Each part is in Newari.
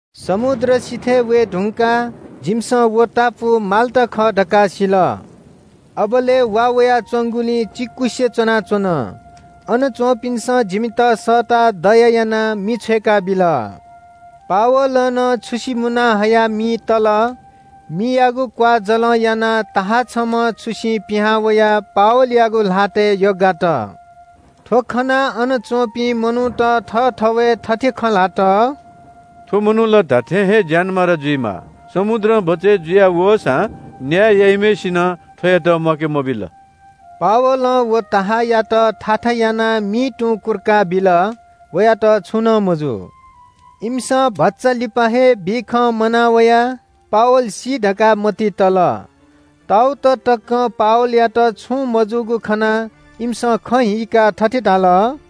समुद्र सिथय् वये धुंकाः जिमिसं व टापु माल्‍टा खः धकाः सिल। अबलय् वा वयाच्‍वंगुलिं चिकुसे च्‍वनाच्‍वन। अन च्‍वंपिन्‍सं जिमित सःताः दया यानाः मि छ्वय्‌काबिल। पावलं नं छुसि मुना हयाः मिइ तल। मियागु क्‍वाःजलं यानाः बिख दुम्‍ह सर्प छम्‍ह छुसिं पिहां वयाः पावलयागु ल्‍हातय् यग्‍गात। वयागु ल्‍हातय् सर्प यग्‍गागु खनाः अन च्‍वंपिं मनूत थःथवय् थथे खँ ल्‍हात – “थ्‍व मनू ला धात्‍थें हे ज्‍यानमारा जुइमाः। समुद्रं बचय् जुया वःसां न्‍याय याइम्‍हय्‌सिनं थ्‍वयात म्‍वाके मबिल।” पावलं व सर्पयात थाथा यानाः मिइ तुं कुर्का बिल। वयात छुं नं मजू। इमिसं भचा लिपा हे बिषं मनावयाः पावल सी धकाः मतिइ तल। ताउत तकं पावलयात छुं मजूगु खनाः इमिसं खँ हीकाः थथे धाल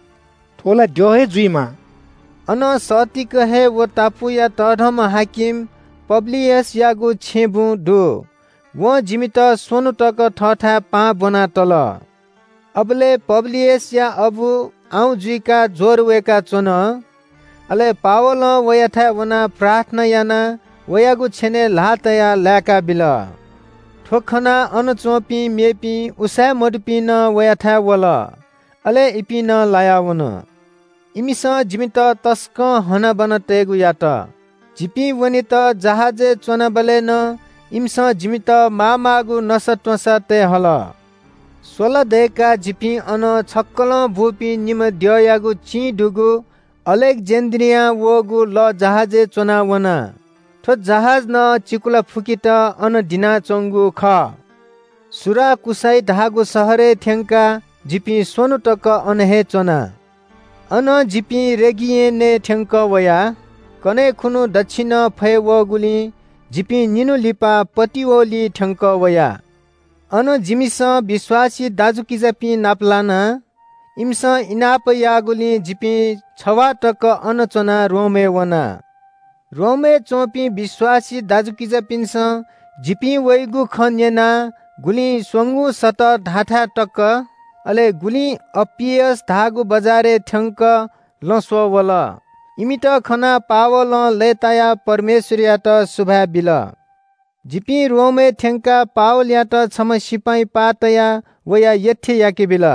– “थ्‍व ला द्यः हे जुइमाः।” अनं सत्तीक हे व टापुया तःधंम्‍ह हाकिम पब्‍लियसयागु छेँबुँ दु। वं जिमित स्‍वन्‍हु तक थःथाय् पाहां ब्‍वना तल। अबलय् पब्‍लियसया अबु आउँ जुइकाः ज्‍वर वय्‌काच्‍वन। अले पावलं वयाथाय् वनाः प्रार्थना यानाः वयागु छेनय् ल्‍हाः तयाः लाय्‌काबिल। थ्‍व खनाः अन च्‍वंपिं मेपिं उसाँय्‌मदुपिं नं वयाथाय् वल। अले इपिं नं लाया वन। इमिसं जिमित तसकं हनाबना तयेगु यात। जिपिं वनेत जहाजय् च्‍वनाबलय् नं इमिसं जिमित मामाःगु नसात्‍वँसा तये हल। स्‍वला दय्‌काः जिपिं अनं छक्‍कलं बूपिं निम्‍ह द्यःयागु चिं दुगु अलेक्‍जेन्‍ड्रियां वःगु लःजहाजय् च्‍वनाः वना। थ्‍व जहाज नं चिकुला फुकेत अन दिनाच्‍वंगु खः। सुराकुसाई धाःगु शहरय् थ्‍यंकाः जिपिं स्‍वन्‍हु तक अन हे च्‍वना। अनं जिपिं रेगियनय् थ्‍यंकः वया। कन्‍हय् खुन्‍हु दच्‍छिनं फय् वःगुलिं जिपिं निन्‍हु लिपा पटिओलिइ थ्‍यंकः वया। अन जिमिसं विश्‍वासी दाजुकिजापिं नापलाना। इमिसं इनाप याःगुलिं जिपिं छवाः तक अन च्‍वनाः रोमय् वना। रोमय् च्‍वंपिं विश्‍वासी दाजुकिजापिन्‍सं जिपिं वइगु खँ न्‍यनाः गुलिं “स्‍वंगू सतः” धाःथाय् तक, अले गुलिं “अप्‍पियस” धाःगु बजारय् थ्‍यंक लँ स्‍वः वल। इमित खनाः पावलं लय्‌तायाः परमेश्‍वरयात सुभाय् बिल। जिपिं रोमय् थ्‍यंकाः पावलयात छम्‍ह सिपाइँ पाः तयाः वया यत्‍थे याकेबिल।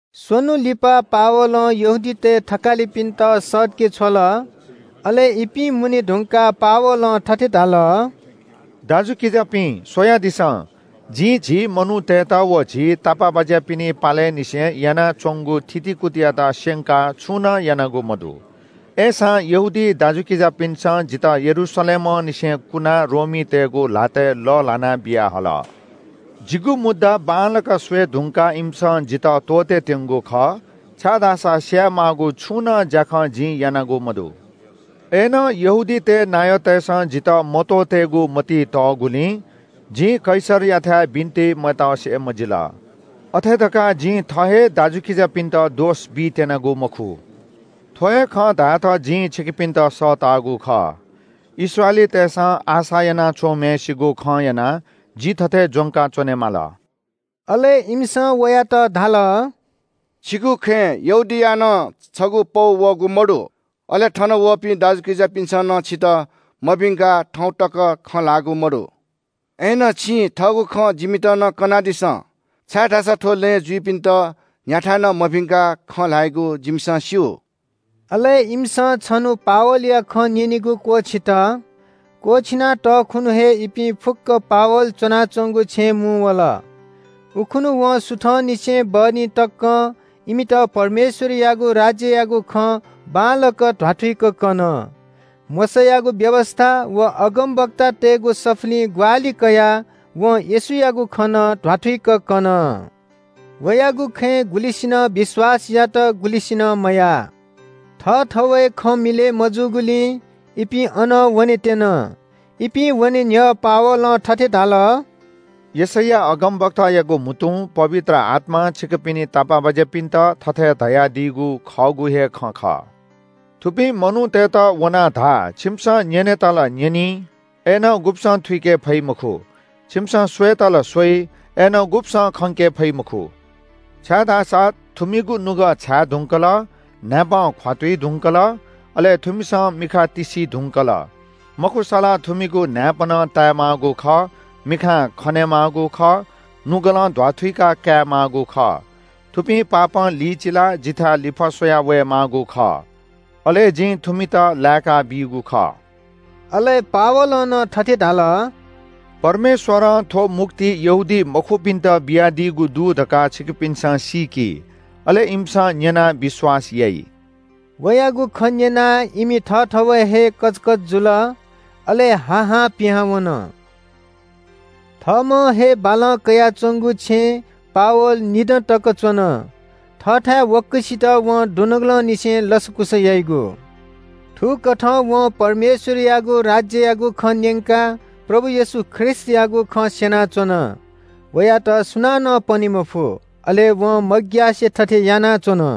स्‍वन्‍हु लिपा पावलं यहूदीतय् थकालिपिन्‍त सःतके छ्वल। अले इपिं मुने धुंकाः पावलं थथे धाल – “दाजुकिजापिं, स्‍वयादिसँ, जिं झी मनूतय्‌त व झी तापाःबाज्‍यापिनि पालय् निसें यानाच्‍वंगु थितिकुतियात स्‍यंकाः छुं नं यानागु मदु। अय्‌सां यहूदी दाजुकिजापिन्‍सं जितः यरूशलेमंनिसें कुनाः रोमीतय्‌गु ल्‍हातय् लःल्‍हाना बियाहल। जिगु मुद्दा बांलाक स्‍वये धुंकाः इमिसं जितः त्‍वःतेत्‍यंगु खः, छाय्‌धाःसा स्‍याये माःगु छुं नं ज्‍याखँ जिं यानागु मदु। अय्‌नं यहूदीतय् नायःतय्‌सं जितः मत्‍वःतेगु मतिइ तःगुलिं जिं कैसरयाथाय् बिन्‍ति मतसे मजिल। अथे धकाः जिं थः हे दाजुकिजापिन्‍त दोष बीत्‍यनागु मखु। थ्‍व हे खँ धायेत जिं छिकपिन्‍त सःतागु खः। इस्राएलीतय्‌सं आशा याना च्‍वंम्‍हय्‌सिगु खं यानाः जि थथे ज्‍वंका च्‍वनेमाल।” अले इमिसं वयात धाल – “छिगु खँय् यहूदियां नं छगू पौ वःगु मदु। अले थन वःपिं दाजुकिजापिन्‍सं नं छितः मभिंकाः थौं तक खँ ल्‍हाःगु मदु। अय्‌नं छिं थःगु खँ जिमित नं कनादिसँ, छाय्‌धाःसा थ्‍व लँय् जुइपिन्‍त न्‍ह्याथाय् नं मभिंकाः खँ ल्‍हाइगु जिमिसं स्‍यू।” अले इमिसं छन्‍हु पावलया खँ न्‍यनेगु क्‍वःछित। क्‍वःछिना तःखुन्‍हु हे इपिं फुक्‍क पावल च्‍वनाच्‍वंगु छेँय् मुंवल। उखुन्‍हु वं सुथंनिसें बहनी तकं इमित परमेश्‍वरयागु राज्‍ययागु खँ बांलाक ध्‍वाथुइक कन। मोशायागु व्‍यवस्‍था व अगमवक्तातय्‌गु सफुलिं ग्‍वाहालि कयाः वं येशूयागु खँ नं ध्‍वाथुइक कन। वयागु खँय् गुलिसिनं विश्‍वास यात, गुलिसिनं मयाः। थःथवय् खँ मिलय् मजूगुलिं इपिं अनं वनेत्‍यन। इपिं वने न्‍ह्यः पावलं थथे धाल – “यशैया अगमवक्तायागु म्‍हुतुं पवित्र आत्‍मां छिकपिनि तापाःबाज्‍यापिन्‍त थथे धयादीगु खःगु हे खँ खः – “‘थुपिं मनूतय्‌त वनाः धा – छिमिसं न्‍यनेत ला न्‍यनी, अय्‌नं गुब्‍सं थुइके फइ मखु। छिमिसं स्‍वयेत ला स्‍वइ, अय्‌नं गुब्‍सं खंके फइ मखु। छाय्‌धाःसा थुमिगु नुगः छाय् धुंकल, न्‍हाय्‌पं ख्‍वातुइ धुंकल, अले थुमिसं मिखा तिस्‍सी धुंकल। मखुसा ला थुमिगु न्‍हाय्‌पनं ताये माःगु खः, मिखां खने माःगु खः, नुगलं ध्‍वाथुइका काये माःगु खः। थुपिं पापं लिचिलाः जिथाय् लिफः स्‍वया वये माःगु खः। अले जिं थुमित लाय्‌काबीगु खः।’ “अले पावलं नं थथे धाल – परमेश्‍वरं थ्‍व मुक्ति यहूदीमखुपिन्‍त बियादीगु दु धकाः छिकपिन्‍सं सीकि, अले इमिसं न्‍यनाः विश्‍वास याइ।” वयागु खँ न्‍यनाः इमि थःथवय् हे कचकच जुल, अले हा हां पिहां वन। थःम्‍हं हे बालं कयाच्‍वंगु छेँय् पावल निदँ तक च्‍वन। थःथाय् वक्‍वसित वं दुनुगलंनिसें लसकुस याइगु। थुकथं वं परमेश्‍वरयागु राज्‍ययागु खँ न्‍यंकाः प्रभु येशू ख्रीष्‍टयागु खँ स्‍यनाच्‍वन। वयात सुनानं पने मफु, अले वं मग्‍यासे थथे यानाच्‍वन।